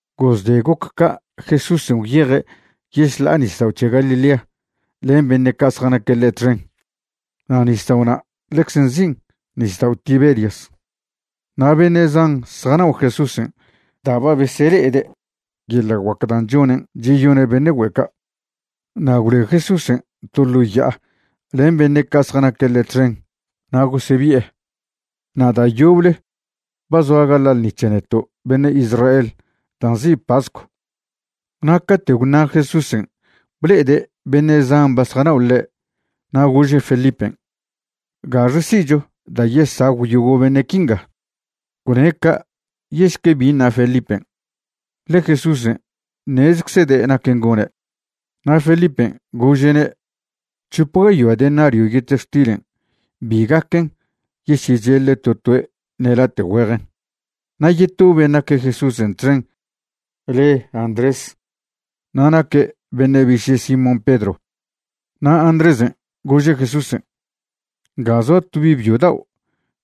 Gozde goc ca' Jesúsen' gwyeje' yešḻa'a nisdao' c̱he Galilea len beṉe' ca' zjanaque' ḻe' txen. Na' nisdao' na' ḻecze nzin' Nisdao' Tiberias. Na' beṉe' zan zjanao' Jesúsen' da' ba besele'ede' yeḻa' guac dan' chonen' cheyone' beṉe' güe' ca'. Na' gwloe Jesúsen' to ḻo ya'a len beṉe' ca' zjanaque' ḻe' txen na' gosebi'e. Na' da' yoble ba zoa gaḻa' ḻṉi c̱he neto' beṉe' Israel da' nzi' pascw. Na' cate' gwṉa' Jesúsen' ble'ede' beṉe' zan ba zjanao' ḻe' na' gože' Felipen': ―¿Gaxe si'cho da' yesagw yogo' beṉe' quinga? Gwne' ca' yešque bi ṉa Felipen', ḻe Jesúsen' ṉezeczede' naquen' gone'. Na' Felipen' gože'ne': ―C̱hop gayoa denario yetextilen' bi gaquen yesyecheḻe to toe' ṉe late' güejen. Na' yeto ben' naque' Jesúsen' txen le Andrés na' naque' beṉe' biše' Simón Pedro. Na' Andrésen' gože' Jesúsen': ―Nga zoa to bi' byo dao'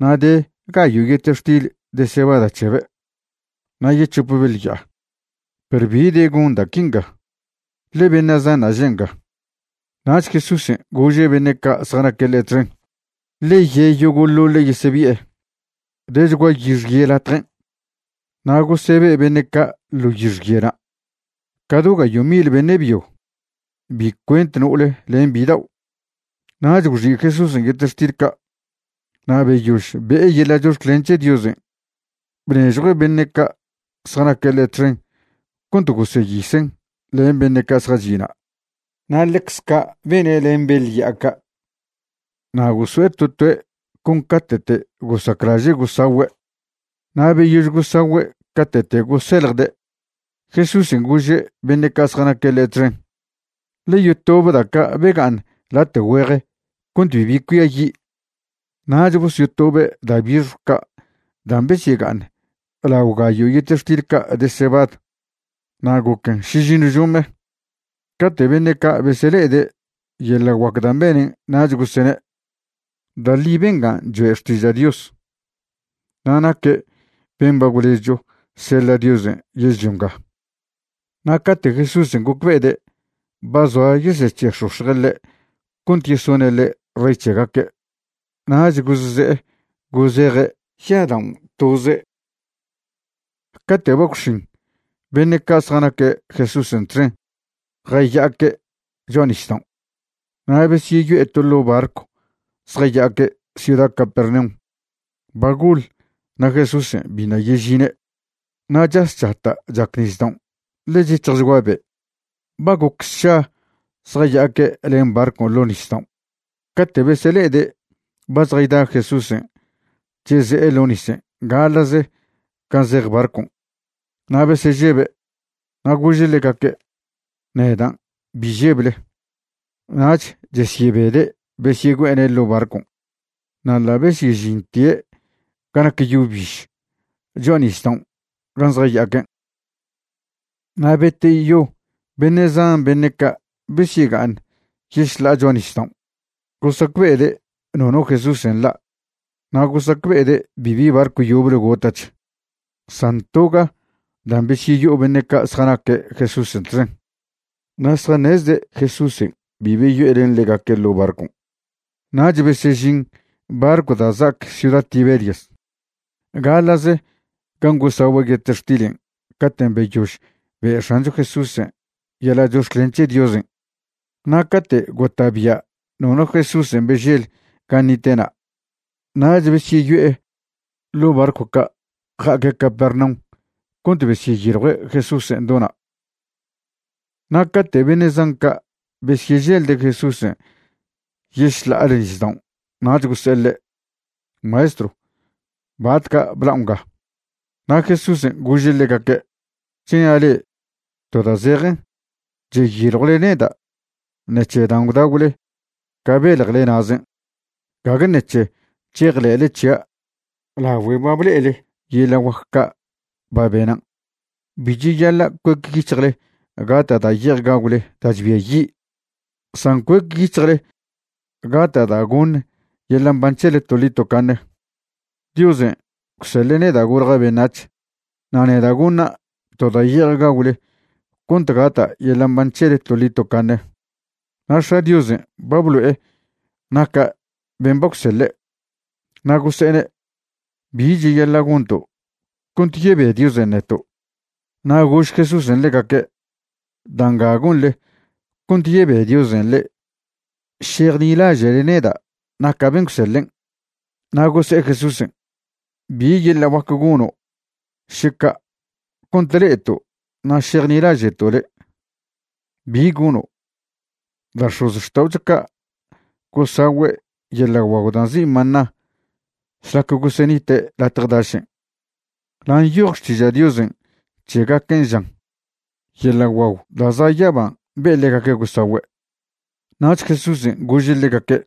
na' de gayo' yetextil de cebada c̱hebe' na' yec̱hope beḻ ya'a. Perw ¿bi de gon da' quinga? ḻe beṉe' zanṉa' že' nga. Nach Jesúsen' gože' beṉe' ca' zjanaque' ḻe' txen: ―Ḻe ye' yogo'ḻoḻe' yesebi'e. Dechgua yixye latjen', na' gosebe' beṉe' ca' ḻo yixyena', ca do gayo' mil beṉe' byo, bi cuent no'ole len bidao'. Nach gwxi' Jesúsen' yetextil ca', na' beyož be'e yeḻa' chox̱clen c̱he Diosen' bnežjuen' beṉe' ca' zjanaque' ḻe' txen cont goseyisen' len beṉe' ca' zjachi' na'. Na' ḻecz ca' bene' len beḻ ya'a ca'. Na' goso'e to toe' con ca'te'te' gosaclaže' gosagüe'. Na' beyož gosagüe' ca'te'te' goseljde', Jesúsen' gože' beṉe' ca' zjanaque' ḻe' txen: ―Ḻe yotobe da' ca' bega'aṉ late' güeje cont bibi cuiayi'. Nach bosyotobe' da' bixjw ca' dan' besyega'aṉ lao gayo' yetextil ca' de cebad, na' goquen šižiṉw žome. Cate' beṉe' ca' besele'ede' yeḻa' guac dan' benen' nach gosene': ―Da' ḻi bengan' choe' xtiža' Dios na' naque' ben' ba gwlezcho seḻa' Diosen' yežḻio nga. Na' cate' Jesúsen' gocbe'ede' ba zoa yesec̱he'ex̱ox̱je' ḻe' cont yesone' ḻe' rey c̱hegaque', nach gozze'e gozeje' ya'adaon' toze'. Cate' ba gwx̱in, beṉe' ca' zjanaque' Jesúsen' txen jaya'aque' cho'a nisdaon'. Na' besyeyo'e to ḻo' barcw zjaya'aque' ciuda Capernaum. Ba goḻ na' Jesúsen' biṉa' yežine'. Na' chas chata' chac nisdaon' ḻe chec̱hjchgua be'. Ba goc sša zjaya'aque' len barcon' ḻo nisdaon' cate' besele'ede' ba zjayda Jesúsen' cheze'e ḻo nisen' gaḻa'ze gan' zej barcon'. Na' besežebe'. Na' gože' ḻegaque': ―Nedan', bi žeble. Nach chesyebede' besyegüe'ene' ḻo' barcon'. Na' ḻa' besyežintie' ga nac yo biž cho'a nisdaon' gan' zjaya'aquen'. Na' beteyo beṉe' zan beṉe' ca' besyega'aṉ yešḻa'a cho'a nisdaon' gosacbe'ede' nono Jesúsen' nḻa' na' gosacbe'ede' bibi barcw yoble gota'ch san toga dan' besyeyo'o beṉe' ca' zjanaque' Jesúsen' txen, na' zjaṉezde' Jesúsen' bi beyo'e len ḻegaque' ḻo' barcon'. Nach besežin barcw da' za'ac ciuda Tiberias gaḻa'ze gan' gosagüe' yetextilen' caten' beyož be' X̱ancho Jesúsen' yeḻa' chox̱clen c̱he Diosen'. Na' cate' gota'bia' nono Jesúsen' bežel gan' nite'na' nach besyeyo'e ḻo' barcw ca' ja'aque' Capernaum cont besyeyiljue' Jesúsen' do na'. Na' cate' beṉe' zan ca' besyeželde' Jesúsen' yešḻa'ale nisdaon' nach gose'e ḻe': ―Maestrw, ¿batca' bla'o nga? Na' Jesúsen' gože' ḻegaque': ―Chnia' le'e to da' zejen, cheyiljwle neda' ṉec̱he dan' gwdagwle ca beljele na'zen', gague ṉec̱he chejḻe'le c̱hia' lagüe ba ble'ele yeḻa' guac ca' ba benan'. Bi cheyaḻa' cuecyic̱hjle gata' da' ye'ej gagwle da' chbiayi', san cuecyic̱hjle gata' da' goṉ yeḻa' mban c̱hele toḻi tocaṉe. Diosen' gwseḻe' neda' golja' beṉac̱h na' neda' goṉa' to da' ye'ej gagwle cont gata' yeḻa' mban c̱hele toḻi tocaṉe. Na' X̱a' Diosen' ba blo'e naca' ben' ba gwseḻe'. Na' gose'ene': ―¿Bi cheyaḻa' gonto', cont yebe Diosen' neto'? Na' gož Jesúsen' ḻegaque': ―Da' nga gonḻe cont yebe Diosen' le'e, šejnilaže'le neda' naca' ben' gwseḻen'. Na' gose'e Jesúsen': ―¿Bi yeḻa' guac gono' še ca' cont le'eto' na' šejnilaže'to' le'? ¿Bi gono'? Da' x̱ozxta'ocho ca' gosagüe' yeḻa' guagw da' nzi' maná šlac gosenite' latje dašen', na' nyoj Xtiža' Diosen' c̱hegaquen', žan: “Yeḻa' guagw da' za' yaban' be'e ḻegaque' gosagüe'.” Nach Jesúsen' gože' ḻegaque':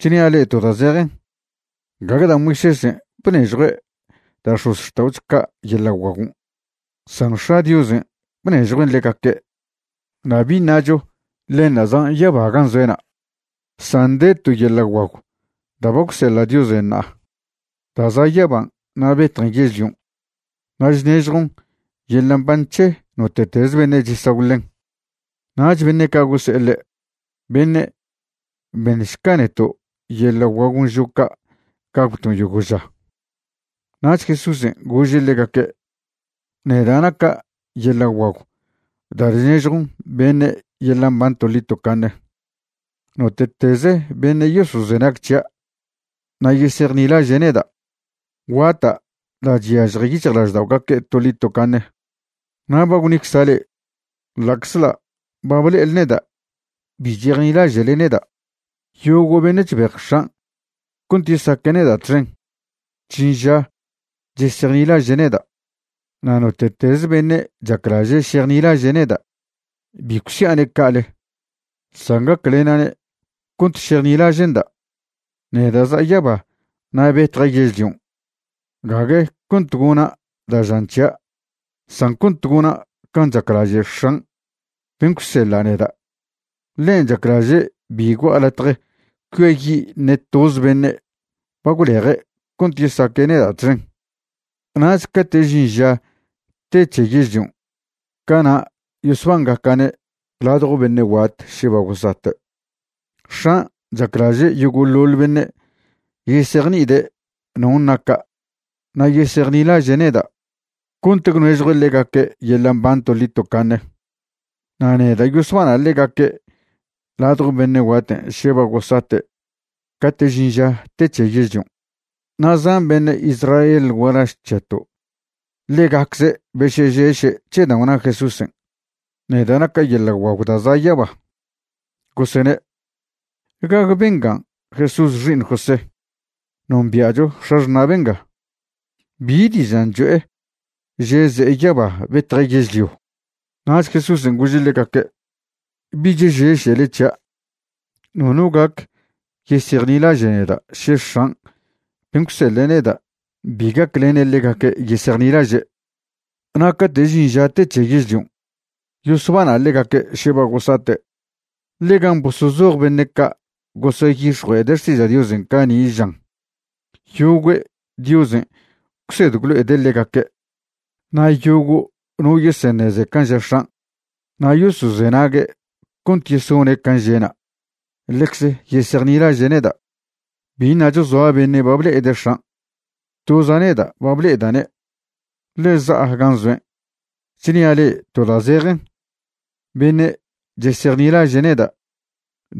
―Chnia' le'e to da' zejen, gague da' Moisésen' bnežjue' da' x̱ozxta'ocho ca' yeḻa' guagon', san X̱a' Diosen' bnežjuen' ḻegaque'. Na' bi ṉacho ḻenṉa' zan' yaba gan' zoe'na', san de to yeḻa' guagw da' ba gwseḻa' Diosen' ṉa'a da' za' yaban' na' betjen yežlion', na' chnežjon yeḻa' mban c̱he note'teze beṉe' chesagw ḻen. Nach beṉe' ca' gose'e ḻe': ―Beṉe', beṉšca neto' yeḻa' guagon' žo' ca' gagwton' yogo' ža. Nach Jesúsen' gože' ḻegaque': ―Neda' naca' yeḻa' guagw da' chnežjon beṉe' yeḻa' mban toḻi tocaṉe. Note'teze beṉe' yosozenag c̱hia' na' yesejnilaže' neda', guata' da' chyažje yic̱hjlažda'ogaque' toḻi tocaṉe. Na' ba gwnicza' le'e, ḻa'czḻa' ba ble'ele neda' bi chejnilaže'le neda'. Yogo' beṉe' chbej X̱an' cont yesaque' neda' txen, chžin ža chesejnilaže' neda'. Na' note'teze beṉe' chaclaže' šejnilaže' neda', bi gwsia'ne' ca'ale, san gaclena'ne' cont šejnilaže'nda'. Neda' za'a yaba na' betja' yežlion' gague cont gona' da' žan c̱hia' san cont gona' can' chaclaže' X̱an' ben' gwseḻa' neda'. Ḻen' chaclaže' bi gua'a latje cuiayi' ṉe toze beṉe' ba gwleje' cont yesaque' neda' txen. Nach cate' žin ža te c̱he yežlion' cana' yosbangaca'ne' ladjo beṉe' guat še ba gosate'. X̱an' chaclaže' yogo'ḻoḻ beṉe' yesejni'ide' non' naca' na' yesejnilaže' neda' cont gwnežjue' ḻegaque' yeḻa' mban toḻi tocaṉe, na' neda' yosbana' ḻegaque' ladjo beṉe' guaten' še ba gosate' cate' žin ža te c̱he yežlion'. Na' zan beṉe' Israel gualaž c̱heto' ḻegacze' besežeše' c̱he dan' gwna Jesúsen': “Neda' naca' yeḻa' guagw da' za' yaba.” Gosene': ―¿Gague bengan' Jesús xi'iṉ José? Nombia'cho x̱axṉa' benga. ¿Bi dižan' cho'e že' ze'e yaba betje' yežlio? Nach Jesúsen' gože' ḻegaque': ―Bich žešele c̱hia'. Nono gac yesejnilaže' neda' še X̱an' ben' gwseḻe' neda' bi gaclene' ḻegaque' yesejnilaže', na' cate' žin ža te c̱he yežlion' yosbana' ḻegaque' še ba gosate'. Ḻe'e gan' bosozoj beṉe' ca' goseyix̱jue'ede' xtiža' Diosen' cani' žan: “Yogüe' Diosen' gwsed gwlo'ede' ḻegaque'.” Na' yogo' no yeseṉeze can' ža X̱an' na' yosozenague' cont yesone' can' že'na', ḻecz yesejnilaže' neda'. ’Bi ṉacho zoa beṉe' ba ble'ede' X̱an'. Toza' neda' ba ble'eda'ne', ḻe za'a gan' zoen'. Chnia' le'e to da' zejen, beṉe' chesejnilaže' neda',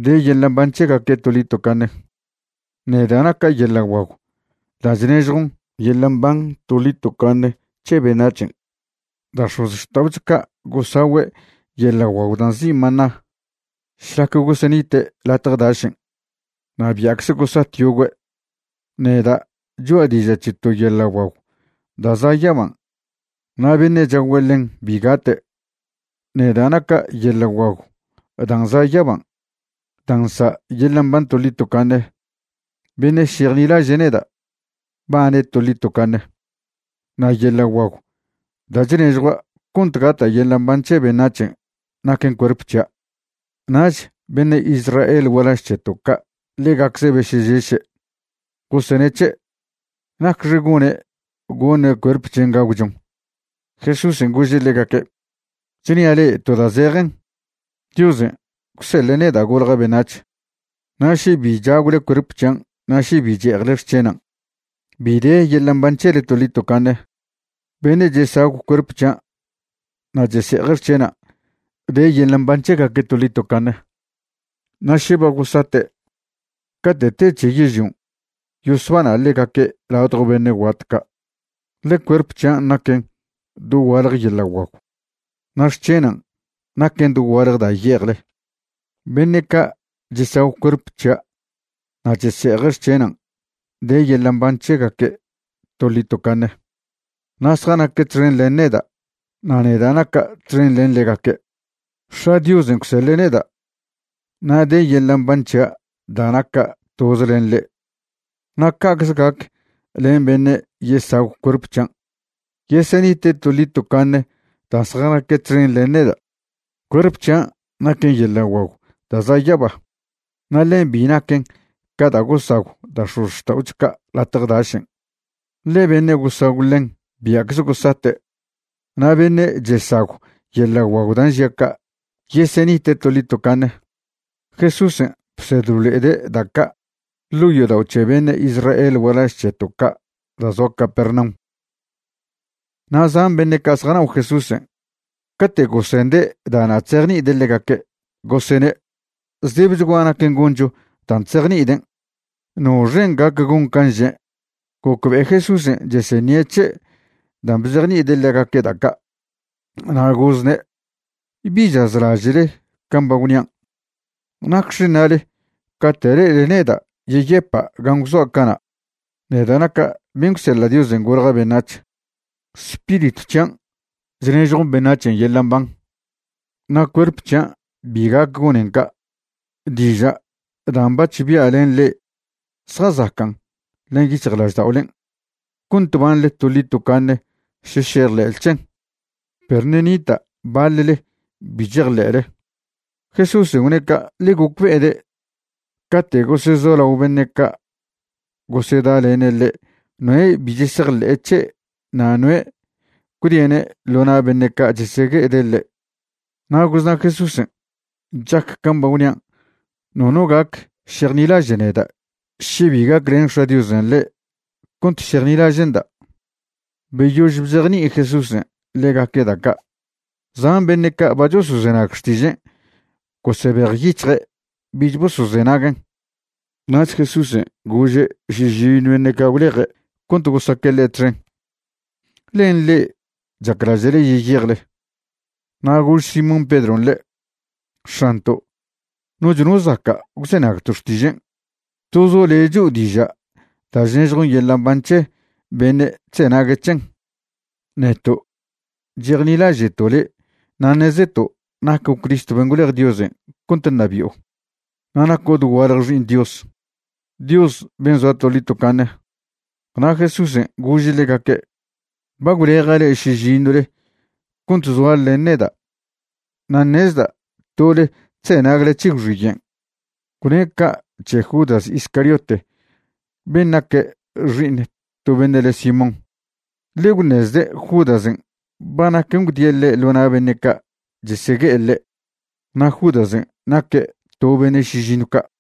de yeḻa' mban c̱hegaque' toḻi tocaṉe. Neda' naca' yeḻa' guagw da' chnežjon yeḻa' mban toḻi tocaṉe c̱he beṉac̱hen'. Da' x̱ozxta'ocho ca' gosagüe' yeḻa' guagw da' nzi' maná šlac gosenite' latje dašen', na' bia'cze gosat yogüe'. Neda' cho'a diža' c̱he to yeḻa' guagw da' za' yaban' na' beṉe' chagw ḻen bi gate'. Neda' naca' yeḻa' guagw dan' za' yaban' dan' nsa' yeḻa' mban toḻi tocaṉe. Beṉe' šejnilaže' neda', bane' toḻi tocaṉe. Na' yeḻa' guagw da' chnežjua' cont gata' yeḻa' mban c̱he beṉac̱hen' naquen cuerp c̱hia'. Nach beṉe' Israel gualaž c̱heto' ca' ḻegacze' besežeše', goseṉe' c̱he': ―¿Nacxe gone' goṉe' cuerp c̱hen' gagwchon? Jesúsen' gože' ḻegaque': ―Chnia' le'e to da' zejen, Diosen' gwseḻe' neda' golja' beṉac̱h, na' še bi chagwle cuerp c̱hian' na' še bi che'ejle xc̱henan', bi de yeḻa' mban c̱hele toḻi tocaṉe. Beṉe' chesagw cuerp c̱hian' na' chese'eje' xc̱henan' de yeḻa' mban c̱hegaque' toḻi tocaṉe, na' še ba gosate', cate' te c̱he yežlion' yosbana' ḻegaque' ladjo beṉe' guat ca'. Ḻe cuerp c̱hian' naquen dogualje yeḻa' guagw, na' xc̱henan' naquen dogualje da' ye'ejle. Beṉe' ca' chesagw cuerp c̱hia' na' chese'eje' xc̱henan' de yeḻa' mban c̱hegaque' toḻi tocaṉe, na' zjanaque' txen len neda' na' neda' naca' txen len ḻegaque'. X̱a' Diosen' gwseḻe' neda' na' de yeḻa' mban c̱hia' da' naca' toze len ḻe'. Na' ca'cze gac len beṉe' yesagw cuerp c̱hian', yesenite' toḻi tocaṉe dan' zjanaque' txen len neda'. Cuerp c̱hian' naquen yeḻa' guagw da' za' yaba. Na' ḻen bi naquen ca da' gosagw da' x̱ozxta'ocho ca' latje dašen', ḻe beṉe' gosagw ḻen bia'cze gosate'. Na' beṉe' chesagw yeḻa' guagw dan' žia' ca', yesenite' toḻi tocaṉe. Jesúsen' bsed blo'ede' da' ca' ḻo' yodao' c̱he beṉe' Israel gualaž c̱heto' ca' da' zoa Capernaum. Na' zan beṉe' ca' zjanao' Jesúsen', cate' gosende' da'na' chzejni'ide' ḻegaque', gosene': ―Zdebechgua naquen goncho dan' chzejni'iden'. ¿Noxen' gac gon can' žen'? Gocbe'e Jesúsen' cheseṉie' c̱he' dan' bzejni'ide' ḻegaque' da' ca', na' gozne': ―¿Bi chazlaže'le can' ba gwnian'? ¿Nacxe ṉale cate' le'ele neda' yeyepa' gan' gwzoa' cana'? neda' naca' ben' gwseḻa' Diosen' golja' beṉac̱h. Spiritw c̱hian' chnežjon beṉac̱hen' yeḻa' mban, na' cuerp c̱hian' bi gac gonen ca'. Diža' dan' bac̱h bia' len le'e zjazacan' len yic̱hjlažda'olen' cont banḻe toḻi tocaṉe še šejḻe'le c̱hen. Perw ṉe' nita' baḻle bi chejḻe'le. Jesúsen' gwne' ca' ḻe gocbe'ede' cate' gosezolao beṉe' ca' gosedalene' ḻe' noe' bi chesejḻe'e c̱he' na' noe' gwdie'ne' ḻo na' beṉe' ca' chesegue'ede' ḻe'. Na' gozna' Jesúsen': ―Chac can' ba gwnian', nono gac šejnilaže' neda' še bi gaclen X̱a' Diosen' ḻe' cont šejnilaže'nda'. Beyož bzejni'i Jesúsen' ḻegaque' da' ca', zan beṉe' ca' ba chosozenag xtižen' gosebejyic̱hje' bich bosozenaguen'. Nach Jesúsen' gože' šižiṉw beṉe' ca' gwleje' cont gosaque' ḻe' txen: ―¿Len le'e chaclaže'le yeyejle? Na' gož Simón Pedron' ḻe': ―X̱anto', noch no zaca' gwzenagto' xtižen'. Tozo' le' cho'o diža' da' chnežjon yeḻa' mban c̱he beṉe' chzenague' c̱hen. Neto' chejnilaže'to' le' na' ṉezeto' naco' Cristo ben' gwlej Diosen' cont ṉabi'o, na' naco' dogualje Xi'iṉ Dios, Dios ben' zoa toḻi tocaṉe. Na' Jesúsen' gože' ḻegaque': ―Ba gwleja' le'e šižiṉwle cont zoale len neda' na' ṉezda' tole chzenagle c̱he gwxiyen'. Gwne' ca' c̱he Judas Iscariote ben' naque' xi'iṉ to beṉe' le' Simón, ḻe gwṉezde' Judasen' ba naquen gwdie' ḻe' ḻo na' beṉe' ca' chesegue'e ḻe', na' Judasen' naque' to beṉe' šižiṉw ca'.